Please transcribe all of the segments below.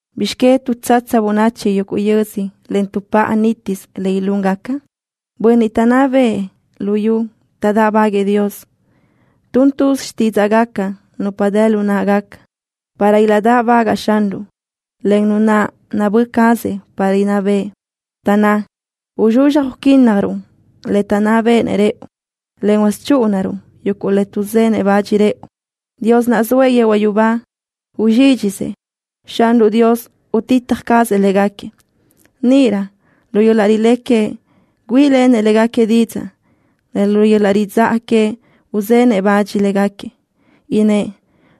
¿Bizx que tuʼtsatsa bönachi yuguʼ yödzö en tuʼpáʼa nítisö le ilúngaca? Bönniʼ taʼnná bëʼë luyú taʼdáʼbaguëʼë Dios. Tun tuz xtídzaʼgaca nupa dë lu náʼagaca para ilaʼdáʼbagaʼ Xanruʼ, en Nu naʼ nabö́ cazëʼ para inná bëʼë, taʼnná: “Uzxuzxaj uquínnajruʼ le taʼnná béʼenëʼ rëʼu, en chúʼunaruʼ yuguʼ le tuʼzenëʼ bach rëʼu.” Dios naʼ zoëʼ yehuaʼ yubá uzxídxisëʼ. Xanruʼ Dios utitaj cazëʼ léguequi. Níʼirö lu yöl-laʼ rilé queëʼ güíʼilenëʼ léguequi didzaʼ, en lu yöl-laʼ ridzáʼa queëʼ uzenëʼ bach léguequi. Innë́ʼ: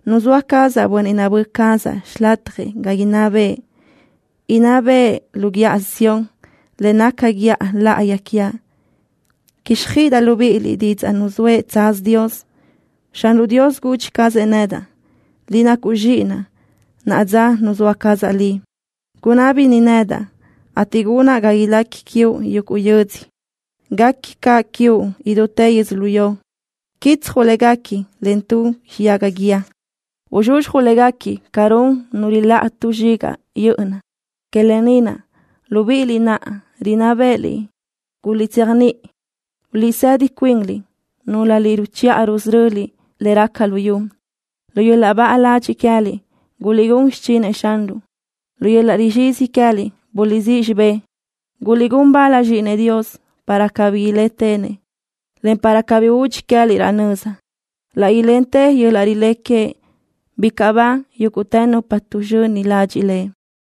“Nuzóa cazaʼ bönniʼ nabö́ cazaʼ xilatjëʼ ga inná bëʼë. Inná bëʼë lu Guíʼa Sión, le naca guíʼa láʼayi quiaʼ.” Quíxjöiʼidaʼ libíʼiliʼ didzaʼ nuzóëʼ tsaz Dios. Xanruʼ Dios gudxi cazëʼ nedaʼ: “Liʼ nacuʼ Zxíʼinaʼ. Naʼa dza nuzóa cazaʼ Liʼ. Gunábini nedaʼ, ateʼ gunaʼ ga ilequi quiuʼ yuguʼ yödzö. Guequi caʼ quiuʼ idútë yödzölió. Quitsjuʼ léguequi len tu xiyaga guíë. Uzxuzxjuʼ léguequi ca run nu riláʼa tu zxigaʼ yö́ʼöna.” Que lë ni naʼ, libíʼiliʼ naʼ rinná bë́ʼëliʼ, guliʼtséajniʼi. Guliʼsedi cuinliʼ, núlöliʼ ruchiʼa rusöröliʼ le raca luyú. Lu yöl-laʼ baʼa ladxiʼ queë́liʼ guliʼgún xichinëʼ Xanruʼ. Lu yöl-laʼ rizxizi queë́liʼ buliʼsíʼ xibë́ʼ. Guliʼgún bal Zxíʼinëʼ Dios para cabí ilétenëʼ, en para cabí udxi queë́liʼ laʼ nöza. Laʼ ilentë yöl-laʼ rilé queëʼ. ¡Bicaʼ ba yúguʼtë nupa tuʼzxöni ladxiʼ Lëʼ!